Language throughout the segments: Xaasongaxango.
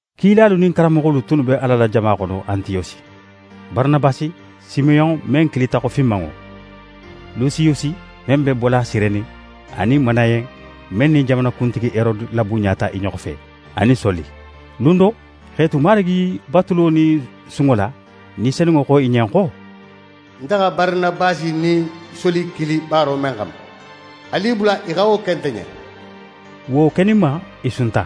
Kilalu nin karanmoxolu tunnu be Ala la jama xono Antiyosi: Baranabasi, Simeyon men kilita xo Finmanŋo, Lusiyusi men be bola Sireni, anin Manayen men nin jamana kuntigi Herode labunɲata i ɲoxo fe, anin Soli. Lun do, x'e tu Marigi batulo nin sunŋo la, Ni Senunŋo xo i ɲen xo: «Nte xa Baranabasi nin Soli kili baaro men xanma, alu i bula i xa wo ke nte ɲen.» Wo keninma, i sunta,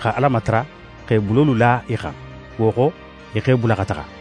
xa Ala matara, x'e bulolu la i xan. Wo xo, i x'e bula xa taxa.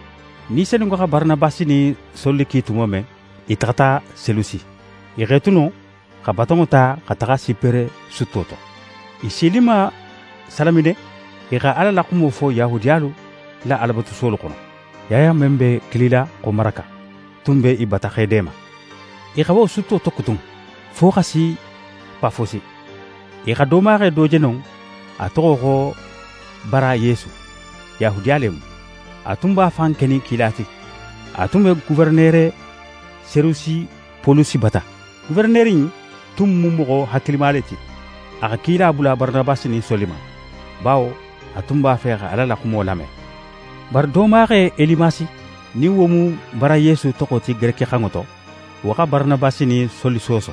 Ni Senunŋo xa Baranabasi nin Soli ki tumo men, i taxata Selusi. I x'e tu non, xa batonŋo ta xa taxa Sipere sutto to. I sininma Salamine, i xa Ala la xumo fo Yahudiyalu la Alabatusuwolu xono. Yaya men be kilila xo Maraka tun be i bata x'e deema. I xa wo sutto tokutun, fo xa si Pafosi. I xa doomaxe do je non, a toxo xo Bara Yesu. Yahudiya le mu. A tun b'a fan kenin kila ti. A tun be Goferenere Serejusi Polusi bata. Goferenere in tun mu moxo hakilima le ti. A xa kila bula Baranabasi nin Soli ma, bawo a tun b'a fe xa Ala la xumo lame. Bari doomaxe Elimasi, nin wo mu Bara Yesu toxo ti gerekixanŋo to, wo xa Baranabasi nin Soli sooso.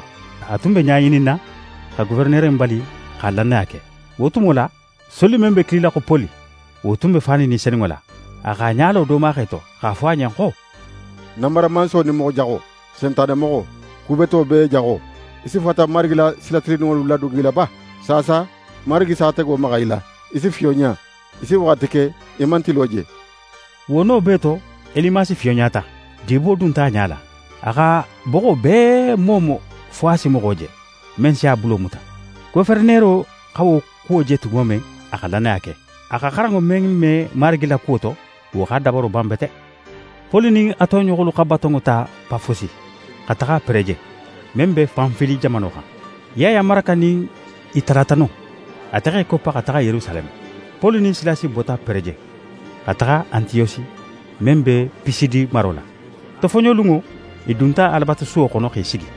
A tun be ɲa ŋininna, xa goferenere bali xa lannaya ke. Wo tumo la, Soli men be kilila xo Poli, wo tun be fanin Ni Senunŋo la, a x'a ɲa lo doomaxe to, x'a fo a ɲen xo: «Nanbaramanso nin moxo jaxo, Sentanemoxo, ku beto bee jaxo! Í si fata Marigi la sila tilinninŋolu ladogila ba? Saasa Marigi s'a tego maxa í la. Í si fiyonɲa. Í si waxati ke í man tilo je.» Wo no bee to, Elimasi fiyonɲata. Dibo dunta a ɲa la. A x'a boxo bee moomo fo a si moxo je, men si a bulo muta. Goferenero xa wo kuwo je tumo men, a xa lannaya ke. A xa xaranŋo men me Marigi la kuwo to, wo x'a dabaro ban bete. Poli nin a toɲoxolu xa batonŋo ta Pafosi, xa taxa Pereje, men be Panfili jamano xan. Yaya Maraka nin i talata non. Ate x'é koppa xa taxa Yerusaleme. Poli nin Silasi bota Pereje, xa taxa Antiyosi men be Pisidi maro la. Tofoɲolunŋo, i dunta Alabatusuwo xono x'e sigi.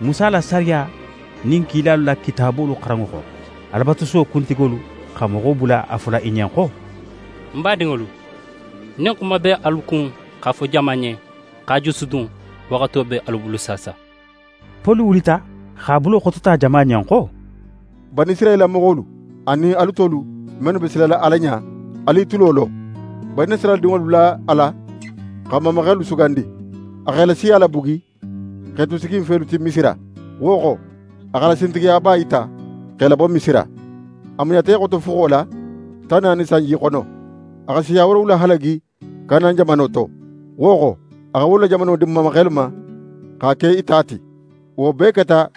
Musa la sariya nin kilalu la kitaabolu xaranŋo xo, Alabatusuwo kuntigolu xa moxo bula a fola i ɲen xo: «N badinŋolu, nin xuma be alu kun x'a fo jama ɲen, x'a jusudun, waxato be alu bulu saasa.» Poli wulita, x'a bulo xotota jama ɲen xo: «Banisirayila moxolu, anin alu tolu mennu be silala Ala ɲa, alu i tulo lo. Banisirayila dinŋolu la Ala xa n mamaxelu sugandi. A x'e la siya labugi, x'e tu siginfelu ti Misira. Wo xo, a x'a la sintigiyaba yita, x'e labo Misira. A muɲata i xoto fuxo la, tan naani sanji xono. A xa siya woorowula halagi Kanan jamano to. Wo xo, a xa wolu la jamano di n mamaxelu ma, x'a ke i ta ti. Wo bee keta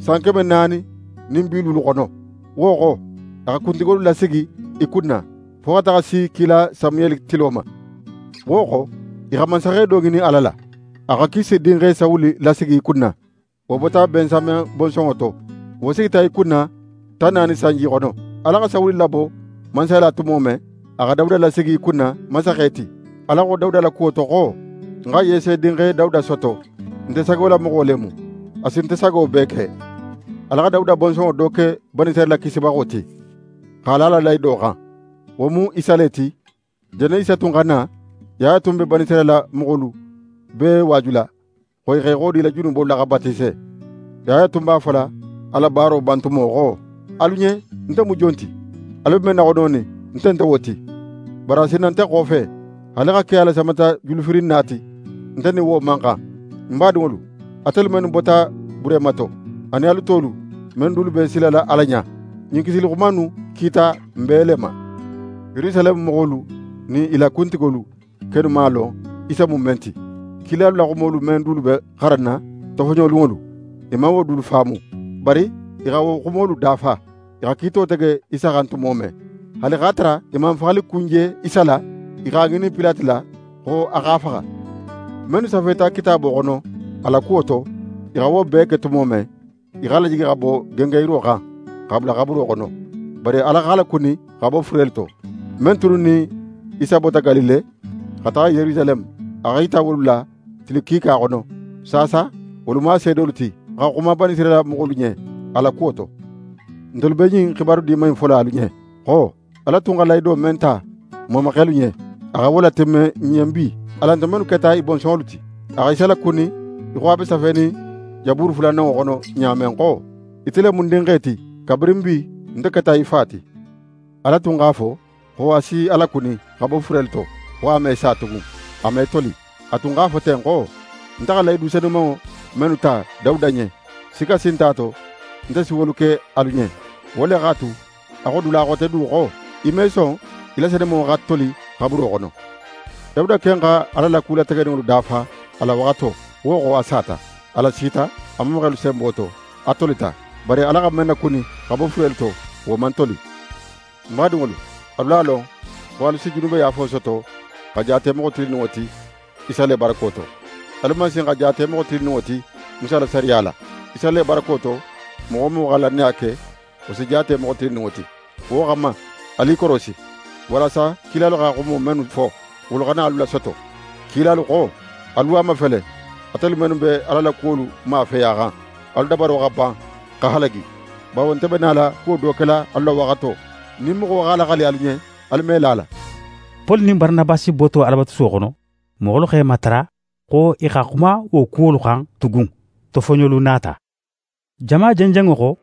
san keme naani nin bi luulu xono. «Wo xo, a xa kuntigolu lasigi i kunna, fo xa taxa si kila Samuyeli tilo ma. Wo xo, i xa mansaxe do ŋinin Ala la. A xa Kise dinxe Sawuli lasigi i kunna. Wo bota Bensamen bonsonŋo to. Wo sigita i kunna tan naani sanji xono. Ala xa Sawuli labo mansaya la tumo men, a xa Dawuda lasigi i kunna mansaxe ti. Ala xo Dawuda la kuwo to xo: “Ń xa Yese dinxe Dawuda soto. Nte sagolamoxo le mu. A si nte sago bee ke.” Ala xa Dawuda bonsonŋo do ke Banisirayila Kisibaxo ti, x'a la a la lahido xan. Wo mu Isa le ti. Jannin Isa tun xa na, Yaya tun be Banisirayila moxolu bee waajula, xo i x'e xodi i la junubolu la, xa batise. Yaya tun b'a fola a la baaro bantumo xo: “Alu ɲen, nte mu jon ti? Alu be men naxononin, nte nte wo ti. Bari a si na nte xofe. Haali xa ke a la samatajulufirinna ti, nte nin wo man xan.” «Ń badinŋolu, ate mennu bota Burehima to, anin alu tolu men dulu be silala Ala ɲa, ɲin kisili xuma innu kita n bee le ma. Yerusaleme moxolu nin i la kuntigolu kennu man a lon Isa mu men ti. Kilalu la xumolu men dulu be xaranna tofoɲolunŋolu, i man wo dulu faamu, bari i xa wo xumolu dafa, i xa kiito tege Isa xan tumo men. Haali x'a tara i man faxalikun je Isa la, i x'a ŋinin Pilate la xo a x'a faxa. Mennu safeta Kitaabo xono a la kuwo to, i xa wo bee ke tumo men, i x'a lajigi xa bo gengenyiro xan, x'a bula xaburo xono. Bari Ala x'a lakuni xa bo furelu to. Men tunnu nin Isa bota Galile, xa taxa Yerusaleme, a x'é yita wolu la tili kiika xono. Saasa, wolu mu a seedolu ti, xa xuma Banisirayila moxolu ɲen a la kuwo to. Ntelu be ɲin xibaru Diman in fola alu ɲen, xo Ala tun xa lahido men ta n mamaxelu ɲen, a xa wo latimme n ɲen bi, alan ntelu mennu keta i bonsonŋolu ti. A xa Isa lakuni í xo a be safenin Jaburu fulananŋo xono ɲa men xo: “Ite le mu ń Dinxe ti; kabirin bi, nte keta í Fa ti.” Ala tun x'a fo xo a si a lakuni xa bo furelu to, xo a me sa tugun, a me toli. A tun x'a fo ten xo: “Nte xa lahidu senumanŋo mennu ta Dawuda ɲen, sikka si nt'a to, nte si wolu ke alu ɲen.” Wo le x'a tu, a xo dula xote du xo: “Í me son, í la senumanŋo xa toli xaburo xono.” Dawuda ken xa Ala la kulategeninŋolu dafa a la waxato, wo xo, a sata. A lasita a mamaxelu senbo to, a tolita. Bari Ala xa men nakuni xa bo furelu to, wo man toli. Ń badinŋolu, alu a lon xo alu si junubeyaafo soto xa jaate moxo tilinninŋo ti Isa le barako to. Alu man sin xa jaate moxo tilinninŋo ti Musa la sariya la. Isa le barako to, moxo wo moxo xa lannaya ke, wo si jaate moxo tilinninŋo ti. Wo xanma, alu i korosi, walasa kilalu xa xumo mennu fo, wolu xana alu lasoto. Kilalu xo: “Alu a mafele, atelu mennu be Ala la kuwolu mafeyaxan, alu dabaro xa ban, xa halagi. Bawo nte be nala kuwo do kela alu la waxato, nin moxo x'a laxali alu ɲen, alu me la a la.”» Poli nin Baranabasi boto Alabatusuwo xono, moxolu x'e matara xo i xa xuma wo kuwolu xan tugun tofoɲolun nata. Jama jenjenŋo xo,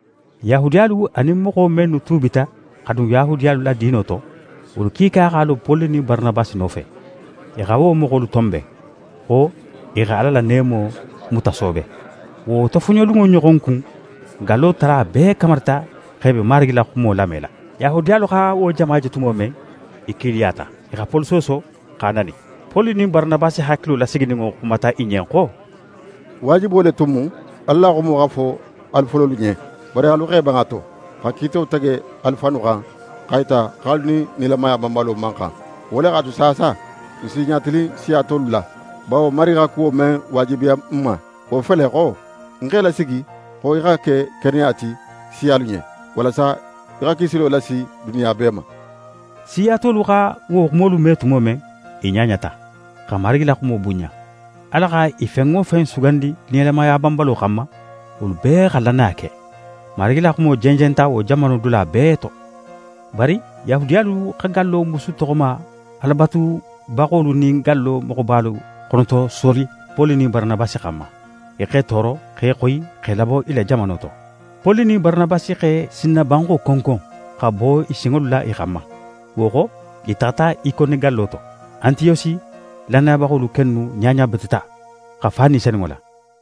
Yahudiyalu anin moxo mennu tuubita xa dun Yahudiyalu la diino to, wolu kiika x'a lo Poli nin Baranabasi nofe. I xa wo moxolu tonben, xo i xa Ala la neemo mutasoobe. Wo tofoɲolunŋo ɲoxon kun, gallo tala bee kamarita x'e be Marigi la xumo lamela. Yahudiyalu xa wo jama je tumo men, i kiiliyata. I xa Poli sooso, x'a nani. Poli nin Baranabasi hakilo lasigininŋo xumata i ɲen xo: «Waajibo le tun mu Ala la xumo xa fo alu fololu ɲen. Bari alu x'e ban a to, xa kiito tege alu fannu xan, x'a yita xo alu nin nilamaya banbalo man xan. Wo le x'a tu saasa, n si i ɲatilin siya tolu la. Bawo Marigi xa kuwo men waajibiya n ma, wo fele xo: “Ń x'é lasigi xo í xa ke keneya ti siyalu ɲen, walasa í xa kisilo lasi duniya bee ma.”» Siya tolu xa wo xumolu me tumo men, i ɲaɲata, xa Marigi la xumo bunɲa. Ala xa i fen wo fen sugandi nilamaya banbalo xanma, wolu bee xa lannaya ke. Marigi la xumo jenjenta wo jamano dula bee to. Bari Yahudiyalu xa gallo musu toxoma Alabatubaxolu nin gallo moxobalu xonotosoli Poli nin Baranabasi xanma; i x'e tooro, x'e xoyi x'e labo i la jamano to. Poli nin Baranabasi x'e sinnabanxo konkon x'a bo i sinŋolu la i xanma, wo xo, i taxata Ikone gallo to. Antiyosi lannayabaxolu kennu ɲaɲabeteta, xa fa Ni Senunŋo la.